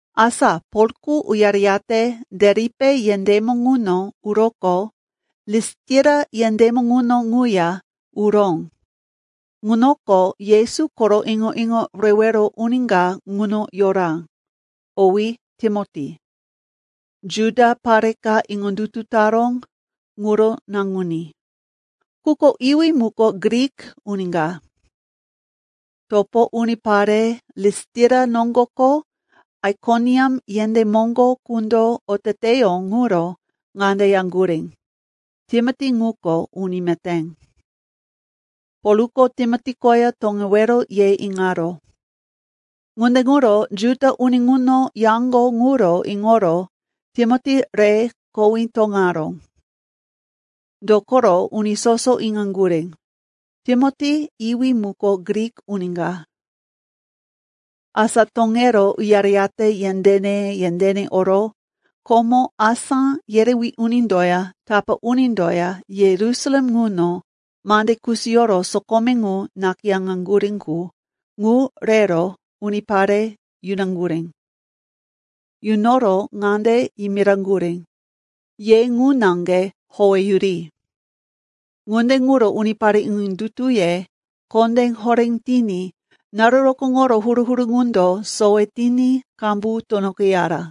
Asa Polko uyareyate Deripe yendémo ŋuno uroqo Listira yendémo ŋuno ŋuya uró. Ŋunoko Yesu koro iŋo-iŋo rewero uni ka ŋuno yora, owí Timoti. Juda pare ka iŋondutu taró, ŋuro naŋuní, quko iwí muko Grik uni ka. Topo unipare Listira noŋgo ko Aikoniam yendé moŋgo qundo oteteyó ŋuro ŋande yaŋgurí, “Timoti ŋuko uni meté.” Polko Timoti koya toŋewero ye iŋaró. Ŋunde ŋuro Juda uni ŋuno yaŋgo ŋuro iŋoro Timoti re kowí toŋaró. Dokoro uni soso iŋaŋgurí, Timoti iwí muko Grik uni ka. Asa toŋero uyareyate yendéne-yendéne oro, komo asá yerewí unindoya tapá unindoya Yerusalem ŋuno mande kusiyoro sokome ŋu nakayáŋaŋgurí qu, ŋu rero unipare yunaŋgurí. Yunoro ŋande yimiraŋgurí, “Ye ŋu naŋge howeyuri.” Ŋunde ŋuro unipare iŋondutuye kondé horé tiní naru rokóŋoro huru-huru ŋundo sowe tiní qambu tunoqeyara.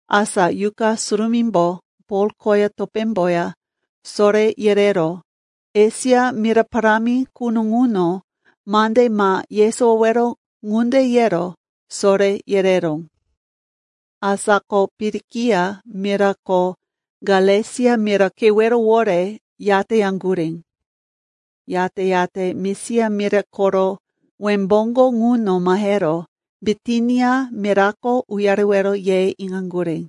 Asa Yuqa Surumímbo Pol koya topémboya soré yerero Esia mira parámi quno ŋuno mande ma yesowowero ŋunde yero soré yereró. Asa ko Pirikia mira ko Galesia mira kewerowore yateyaŋgurí. Yate-yate Misia mira koro wembóŋgo ŋuno mahero Bitinia mirako uyarewero ye iŋaŋgurí.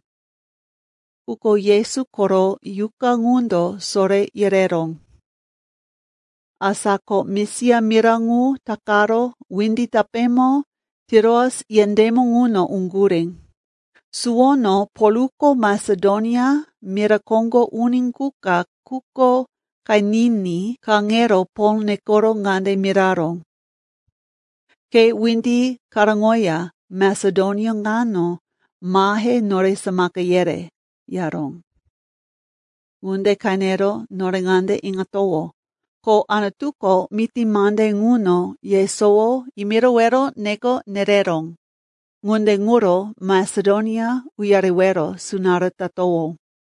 Quko Yesu koro Yuqa ŋundo soré yereró. Asa ko Misia mira ŋu takaro windi tapémo Tiroas yendémo ŋuno uŋgurí. Suwono Polko Masedonia mira koŋgo uni qu ka quko qeniní kaŋero Pol nekoro ŋande miraró, “Ke windi karóŋoya Masedonia ŋano mahe nore samaka yere,” yaró. Ŋunde qenero nore ŋande iŋatowó, ko Anutuko miti mande ŋuno yesowo yimirowero neko nereró. Ŋunde ŋuro Masedonia uyarewero sunará tatowó.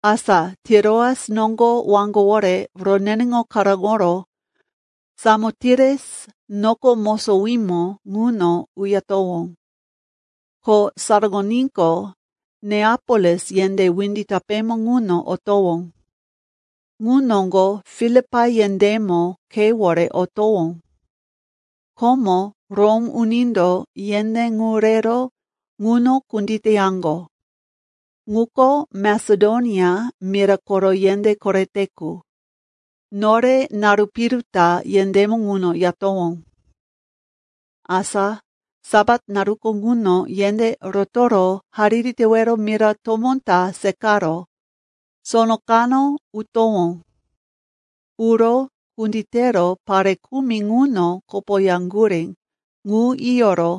Asa Tiroas noŋgo waŋgowore roneneŋo karóŋoro Samotires noko mosowímo ŋuno uyatowó. Ko saraŋoníqo, Neapolis yendé windi tapémo ŋuno otowó. Ŋu noŋgo Filipai yendémo khewore otowó. Komo Rom unindo yendé ŋu rero ŋuno kunditeyaŋgo. Ŋuko Masedonia mira koro yendé korete qu. Nore naru piru ta yendémo ŋuno yatowó. Asa Sapat naruko ŋuno yendé rotoro hariri tewero mira tomó ka seqaro sono kano utowó. Uro kunditero pare kumi ŋuno kopoyaŋgurí ŋu yiyoro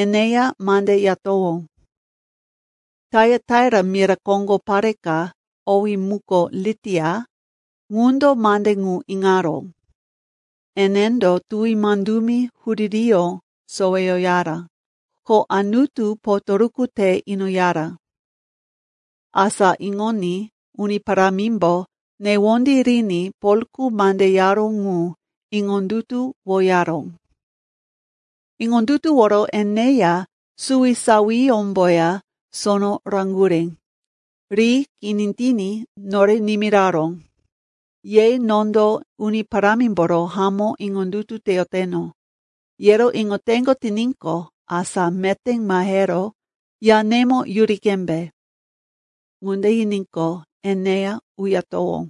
eneya mande yatowó. Taiataira mira koŋgo pare ka, owí muko Litia, ŋundo mande ŋu iŋaró. Enendo tuwi mandumi huririyó soweyoyara, ko Anutu potoruku te inoyara. Asa iŋoní Uni Parámimbo newondí riní Polko mande yaró ŋu iŋondutuwoyaró. Iŋondutuworo eneya suwisawiyómboya sono raŋgurí. Ri kini tiní nore nimiraró, “Ye nondo Uni Parámimboro hamó iŋondutu teyoteno, yero iŋoteŋgo tiníqo, asa meté mahero yanemo yuri qembe.” Ŋunde yiníqo, eneya uyatowó.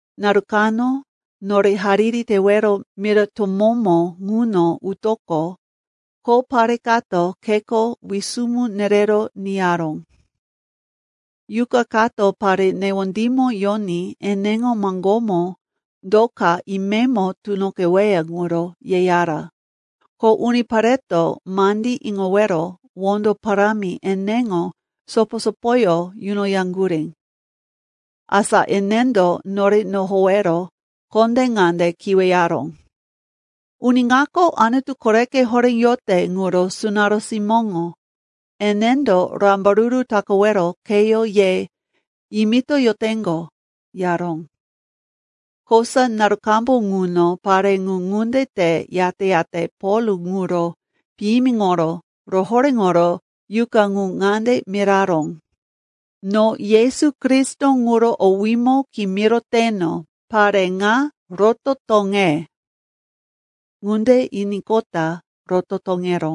Naru kano nore hariri tewero mira tomómo ŋuno utoqo kho pare kato kheko wisumu nerero niyaró. Yuqa kato pare newondímo yoní eneŋo maŋgómo do ka imemo tunoqeweya ŋuro yeyara, ko unipareto mandí iŋowero wondo parámi eneŋo sopo-sopoyó yunoyaŋgurí. Asa enendo nore nohowero kondé ŋande kiweyaró, “Uni ŋako Anutu Koreko Horé yote ŋuro sunará simóŋo. Enendo rambaruru takawero kheyó ye yimitoyoteŋgo,” yaró. Kosa naru qambu ŋuno pare ŋu ŋunde te yate-yate Pol ŋuro piyimiŋoro rohoréŋoro yuqa ŋu ŋande miraró, “No Yesu Kristo ŋuro owímo kimiroteno, pare ŋa roto toŋe!” Ŋunde yiníqota roto toŋeró.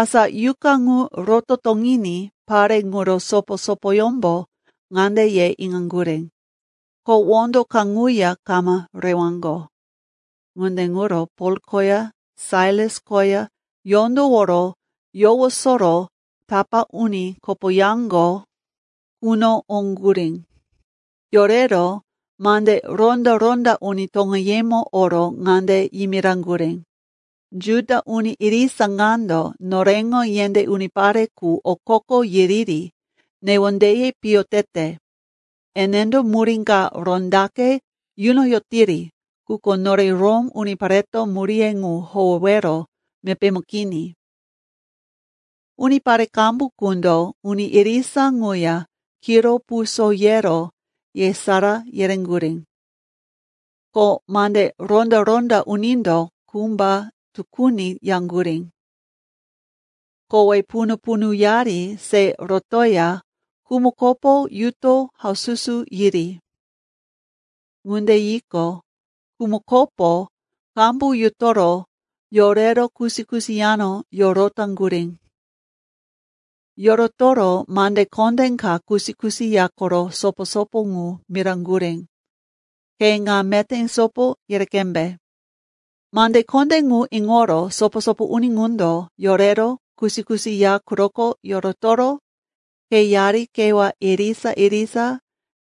Asa yuqa ŋu roto toŋiní pare ŋuro sopo-sopoyómbo ŋande ye iŋaŋgurí, ko wondo kaŋuya kama rewaŋgo. Ŋunde ŋuro Pol koya Sailas koya yondoworo yowosoro tapá uni kopoyaŋgo quno oŋgurí. Yorero mande ronda-ronda uni toŋeyemo oro ŋande yimiraŋgurí, “Juda uni irisa ŋando noreŋo yendé unipare qu okoko yiriri newondeye piyo tete. Enendo murí ka rondaqe yunoyotiri, quko nore Rom unipareto muríye ŋu howewero mepémo kini.” Unipare qambu qundo uni irisa ŋuya kiro puso yero yesará yereŋgurí. Ko mande ronda-ronda unindo kumba tukuni yaŋgurí, kowe punu-punuyari se rotoya kumukopo yuto haususu yiri. Ŋunde yiqo, kumukopo qambu yutoro yorero kusi-kusi yano yorotaŋgurí. Yorotoro mande kondé ka kusi-kusi ya koro sopo-sopo ŋu miraŋgurí, ke ŋa meté sopo yere qembe. Mande kondé ŋu iŋoro sopo-sopo uni ŋundo yorero kusi-kusi ya quroko yorotoro kheyari kewá irisa-irisa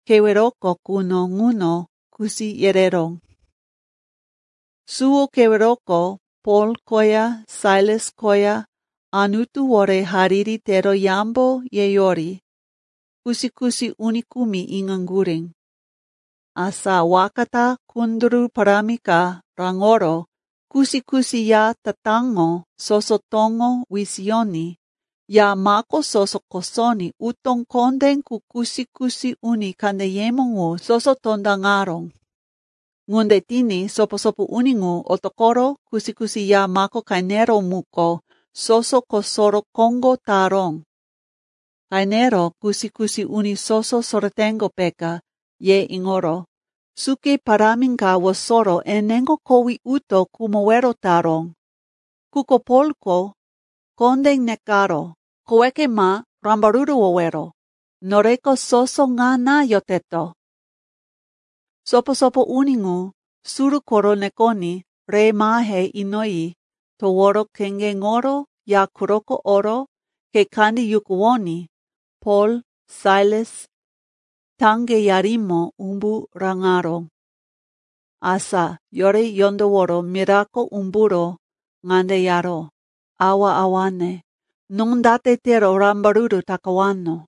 keweroko quno ŋuno kusi yereró. Suwo keweroko Pol koya Sailas koya Anutuwore hariri tero yambo yeyori kusi-kusi uni kumi iŋaŋgurí. Asa waka ta kunduru parámi ka raŋoro kusi-kusi ya tatáŋo soso toŋo wisiyoní ya mako soso kosoní utó kondé qu kusi-kusi uni kandeyemo ŋu soso tondaŋaró. Ŋunde tiní sopo-sopo uni ŋu otoqoro kusi-kusi ya mako qeneró muko soso kosoro koŋgó taró. Qenero kusi-kusi uni soso soreteŋgo, peka, ye iŋoro suke parámi ka wosoro eneŋo kowí uto khumowero taró. Quko Polko kondé nekaró, “Koweke ma rambaruruwowero! Noreko soso ŋana yoteto!” Sopo-sopo uni ŋu suru koro nekoní re mahe inoyi toworo kheŋgeŋoro ya quroko oro khe kandí yukuwoní Pol, Sailas taŋgeyarimo umbu raŋaró. Asa yore yondoworo mirako umburo ŋande yaró, “Awa-awane, no date tero rambaruru takawano?”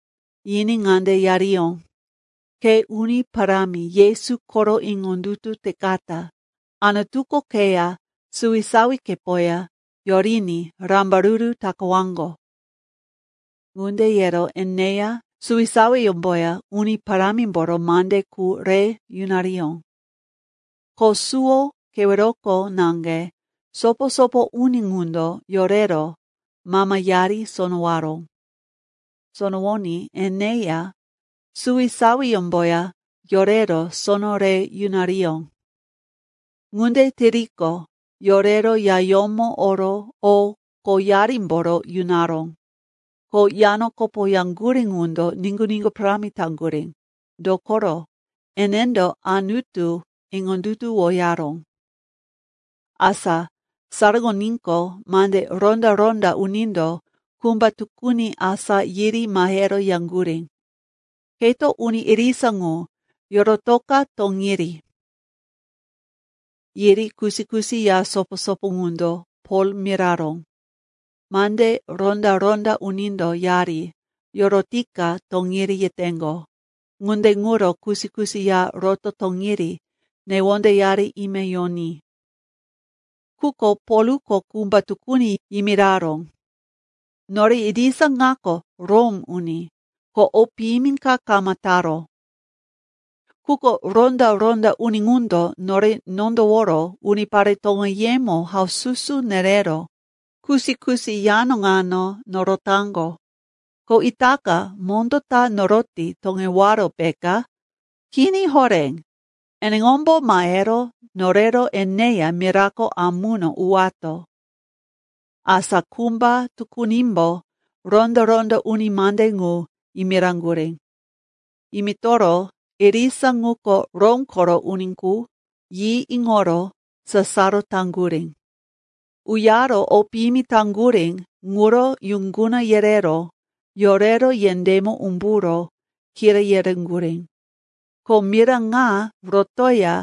Yiní ŋande yariyó, “Ke Uni Parámi Yesu koro iŋondutu tekata, Anutuko keya suwisawikepoya yoriní rambaruru takawaŋgo.” Ŋunde yero eneya suwisawiyómboya Uni Parámimboro mande qu re yunariyó. Ko suwo keweroko naŋge sopo-sopo uni ŋundo yorero mamayari sonowaró. Sonowoní eneya suwisawiyómboya yorero sono re yunariyó. Ŋunde tiriqo, yorero yayómo oro o qoyarimboro yunaró. Ko yano kopoyaŋgurí ŋundo niŋgu-niŋgu parámi taŋgurí, dokoro enendo Anutu iŋondutuwoyaró. Asa saraŋoníqo, mande ronda-ronda unindo kumba tukuni asá yiri mahero yaŋgurí, “Keto uni irisa ŋu yorotoka toŋiri.” Yiri kusi-kusi ya sopo-sopo ŋundo Pol miraró, “Mande ronda-ronda unindo yari yorotika toŋiri yeteŋgo. Ŋunde ŋuro kusi-kusi ya roto toŋiri newondeyari ime yoní.” Quko Polko kumba tukuni yimiraró, “Nore irisa ŋako Rom uni, ko o piyimi ka kama taro. Quko ronda-ronda uni ŋundo nore nondoworo unipare toŋeyemo haususu nerero kusi-kusi yano ŋano norotaŋgo. Ko itaka mondó ta noroti toŋewaro, peka? Kini horé! Eneŋombo mahero norero eneya mirako amuno uwato.” Asa kumba tukunimbo ronda-ronda uni mande ŋu yimiraŋgurí. Yimitoro, irisa ŋuko Rom koro uni qu, yi iŋoro sasaro taŋgurí. Uyaro o piyimi taŋgurí ŋuro yuŋguna yerero yorero yendémo umburo kira yereŋgurí, ko mira ŋa rotoya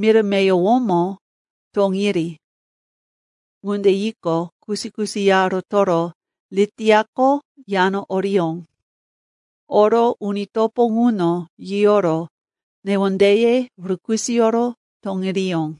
mira meyowomo toŋiri. Ŋunde yiqo, kusi-kusi ya rotoro Litiako yano oriyó. Oro uni topo ŋuno yiyoro newondeye rukisoyoro toŋiriyó.